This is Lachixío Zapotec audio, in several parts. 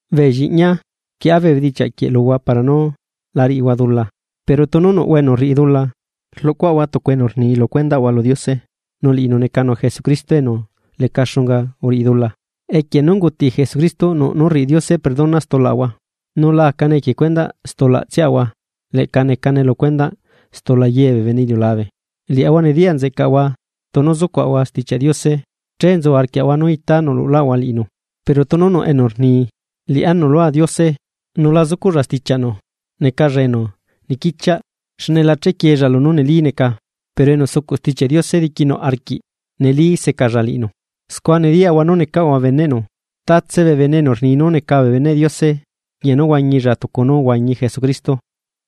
Bee lliꞌñia, rquieꞌa bee bedichiaꞌ quieꞌ luhua para nú la riꞌihua dula. Pero tunu nuꞌhua enu rriꞌi dula, rluꞌcuaꞌahua tucu enu rni lu cuendaꞌahua lu Diose, nu liꞌinu necanu Jesucristo enu leca xunga uriꞌi dula. Equie nú unguti Jesucristo, nuꞌ nú rriꞌi Diose perdona stulaꞌahua. Nu la acane equie cuendaꞌ stulaꞌtsiaꞌahua, leꞌca necane lu cuendaꞌ stula ye bee bene iliulabe. Liaꞌahua nediyaꞌ nzeꞌcaꞌahua tunu sucuaꞌahua Stichiaꞌ Diose, che nzu arquiaꞌahua nú itá nuluꞌlaꞌahua liꞌinu. Pero tunu nuꞌ enu rni: “Liꞌá nuꞌlua Diose”, nu la zucuꞌlla stichiaꞌnu, necalla enu niquichiaꞌ, xne la chequieella lunú neli neca. Pero enu sucuꞌ Stichiaꞌ Diose diquinuꞌ arquiꞌ neli secalla liꞌinu. Scua nediyaꞌahua nú necaꞌahua beneꞌnu. Tatse bene enu rni nú neca beneꞌ Diose, rquiꞌña nú huañilla tucu nú uhuañi Jesucristo.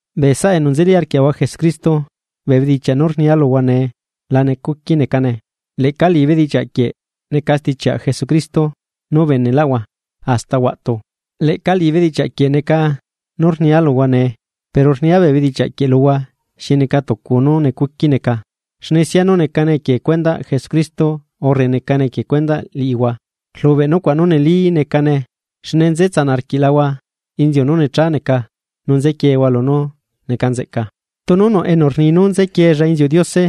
Bee saꞌa enu nzeli arquiaꞌahua Jesucristo, bee bedichiaꞌ nú rnia luhua nee la necuqui necane, leꞌca liꞌi bedichiaꞌ quieꞌ neca stichiaꞌ Jesucristo nú ubeneꞌlaꞌhua hasta huaꞌtu. Leꞌca liꞌi bedichiaꞌ quieꞌ neca nú rnia luhua nee. Pero rnia bee bedichiaꞌ quieꞌ luhua xi neca tucu nú necuqui neca, xne sianu necane equie cuendaꞌ Jesucristo urre necane equie cuendaꞌ liꞌihua, rlubeꞌ nucuaꞌ nu neli necane xne nze tsanaꞌ arquiꞌlahua inziu nú necha neca nu nzequiehua lunú neca nzeꞌca. Tunu nuꞌ enu rni nú nzequieella inziuꞌ Diose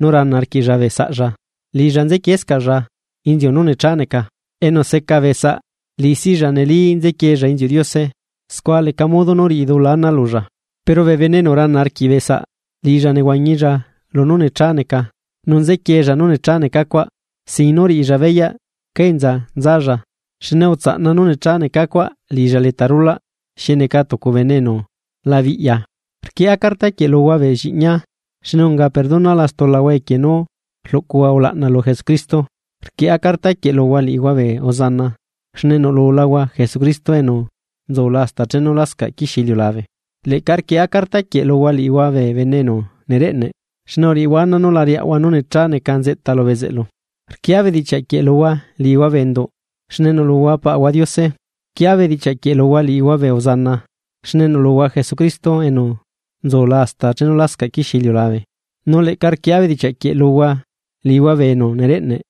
nu rana arquiꞌlla bee saꞌlla, liꞌilla nzequieescaꞌlla inziu nú necha neca. Enu seca bee saꞌ liꞌi silla neli nzequieella inziuꞌ Diose, scua leca modo nú riꞌi dula ana lulla. Pero bene enu rana arquiꞌ bee saꞌ liꞌilla nehuañilla lunú necha neca, nu nzequiella nú necha neca cuaꞌ, sin nú riꞌilla beyaꞌ cá enza nzalla, xne utsaꞌna nú necha neca cuaꞌ liꞌilla leta rulaꞌ xi neca tucu bene enu la biꞌya. Rquieꞌa carta quieꞌ luhua bee lliꞌñia, xne unga perdonala stulahua equie nú rluꞌcuhua ulaꞌna lu Jesucristo. Rquieꞌa carta quieꞌ luhua liꞌihua bee uzana, xne nuꞌlulahua Jesucristo enu nzula hasta chenu lascaꞌ quixie iliulabe. Leꞌca rquieꞌa carta quieꞌ luhua liꞌihua bee bene enu nereꞌne xne uriꞌihua ana nú la riaꞌhua nú necha neca nzeꞌta lu bezeꞌlu. Rquieꞌa bedichiaꞌquie luhua liꞌihua bee enduꞌ, xne nuꞌlulahua Paꞌahua Diose. Rquieꞌa bedichiaꞌ quieꞌ luhua liꞌihua bee uzana, xne nuꞌlulahua Jesucristo enu nzula hasta chenu lascaꞌ quixie iliulabe, nu leꞌca rquieꞌa bedichiaꞌ quieꞌ luhua liꞌihua bee enu nereꞌneꞌ,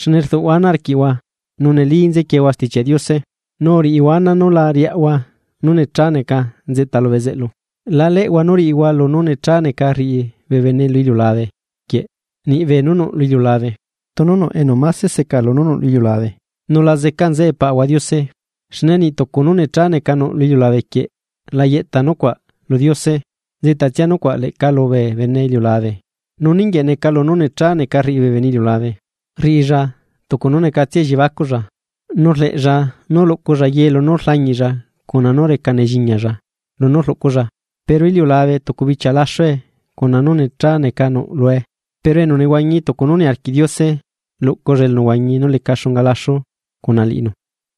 xne rduꞌhua ana arquiꞌhua nu neli nzequieehua Stichiaꞌ Diose, nu uriꞌihua ana nú la riaꞌhua nú necha neca nzeꞌta lu bezeꞌlu. La leꞌhua nú riꞌihua lunú necha neca rriꞌi bee bene lu iliulabe quieꞌ niꞌbee nú nuꞌ lu iliulabe. Tunu nuꞌ enu máse seca lunú nuꞌ lu iliulabe, nu la zeca nzeꞌe Paꞌahua Diose. Xne niꞌ tucu nú necha neca nuꞌ lu iliulabe quieꞌ la yeꞌta nucuaꞌ lu Diose, nzeꞌta tsia nucuaꞌ leꞌca lubee bene iliulabe. Nu ninguieꞌ neca lunú necha neca rriꞌi bee bene iliulabe. Riꞌilla tucu nú necatsia elliebacuꞌlla, nu rleꞌlla nú luꞌculla ye lunú rlañiꞌlla cuna nú reca nelliñalla lunú rluꞌculla. Pero iliulabe tucu bichia laxue cuna ye beenú necha neca rriꞌi bee bene. Pero enu nehuañi tucu nú niarquiꞌ Diose, luꞌculla elunehuañi nú leca xunga laxu cuna liꞌinu.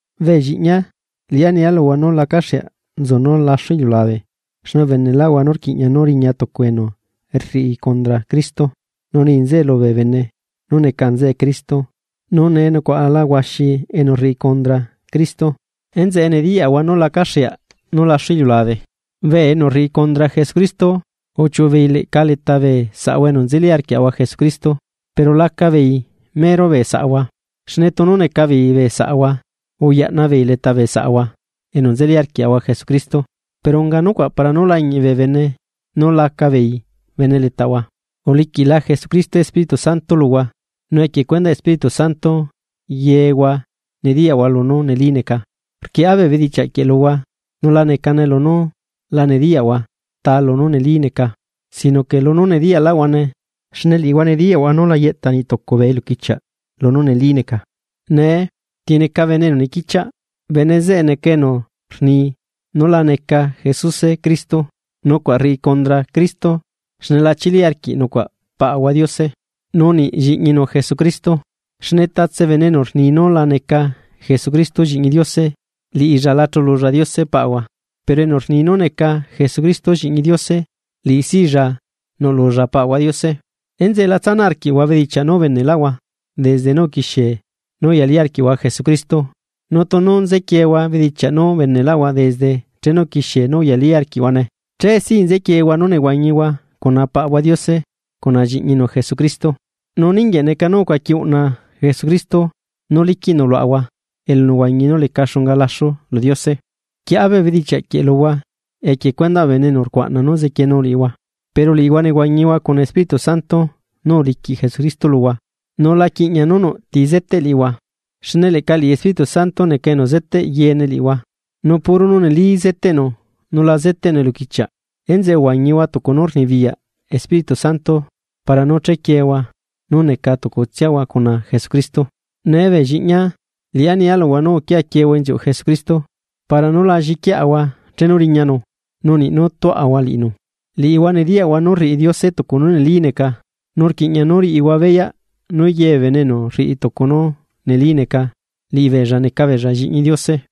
Bee lliꞌñia, liꞌá nia luhua nú lacaxeaꞌ nzu nú laxu iliulabe. Xne ubeneꞌlaꞌhua nú rquiꞌña nú riña tucu enu rriꞌi condra Cristo, nu ni nzeꞌe lubee bene nú neca nzeꞌe Cristo, nu nee nucuaꞌala huaxi enu rriꞌi condra Cristo, enzeꞌe nediyaꞌahua nú lacaxeaꞌ nú laxu iliulabe. Bee enu rriꞌi condra Jesucristo, uchiuꞌu beei leꞌca leta bee saꞌahua enu nzeli arquiaꞌahua Jesucristo, pero laca beei mero bee saꞌahua, xne tunu neca beei bee saꞌahua ayaꞌna beei leta bee saꞌahua enu nzeli arquiaꞌahua Jesucristo. Pero unga nucuaꞌ para nú lañiꞌ bee bene nú laca beei bene letaꞌahua. Uliquiꞌla Jesucristo Espíritu Santo luhua, nu equie cuendaꞌ Espíritu Santo yehua nediyaꞌhua lunú neli neca. Rquieꞌa bee bedichiaꞌ quieꞌ luhua, nu la necane lunú la nediyaꞌhua ta lunú neli neca, sino que lunú nediyaꞌlaꞌhuane, xne liꞌihua nediyaꞌhua nú la yeꞌta niꞌ tucu bee eluquichiaꞌ lunú neli neca. Nee, ¿ti neca bene enu niquichiaꞌ? Bene zeꞌe neca enu rni nú la neca Jesuse liꞌi Cristo. Nucuaꞌ rriꞌi condra Cristo xne la chili arquiꞌ nucuaꞌ Paꞌahua Diose, nu niꞌ Lliꞌñinu Jesucristo. Xne tatse bene enu rni nú la neca Jesucristo Lliꞌñi Diose, liꞌilla la chululla Diose Paꞌahua. Pero enu rni nú neca Jesucristo Lliꞌñi Diose, liꞌisilla nuꞌlulla Paꞌahua Diose. Enzeꞌe la tsanaꞌ arquiꞌhua bedichiaꞌ nú ubeneꞌhua desde nú uquixiehua nú uyali arquiꞌhua Jesucristo, nu tunu nzequiehua bedichiaꞌ nú ubeneꞌhua desde chenu uquixie nú uyali arquiꞌhuane, che si nzequiehua nú nehuañihua cuna Paꞌahua Diose cuna Lliꞌñinu Jesucristo. Nu ninguieꞌ neca nú ucuaqui uꞌna Jesucristo, nú liquiꞌnu luaꞌahua elunehuañi nú leca xunga laxu lu Diose. Rquieꞌa bee bedichiaꞌ quieꞌ luhua, equie cuendaꞌ bee bene enu rcuaꞌna nú zequienu liꞌihua. Pero liꞌihua nehuañihua cuna Espíritu Santo nú uliquiꞌ Jesucristo luhua, nu la quiꞌña nú nuꞌ ti zeteꞌ liꞌihua, xne leꞌca liꞌi Espíritu Santo neca enu zeteꞌ yeene liꞌihua, nu puro nú neli zeteꞌnu nu la zeteꞌnu eluquichiaꞌ. Enzeꞌe uhuañihua tucu nú rnibiyaꞌ Espíritu Santo para nú chequiehua nú neca tucutsiahua cuna Jesucristo. Nee bee lliꞌñia, liꞌá nia luhua nú uquia quieehua inziuꞌ Jesucristo, para nú la lliquiaꞌahua chenu riñanu, nu niꞌ nú tuaꞌahua liꞌinu. Liꞌihua nediyaꞌhua nú rriꞌi Diose tucu nú neli neca, nu rquiꞌña nú riꞌihua beyaꞌ nú ye bee bene enu rriꞌi tucu nú neli neca, liꞌibeella neca beella Lliꞌñi Diose.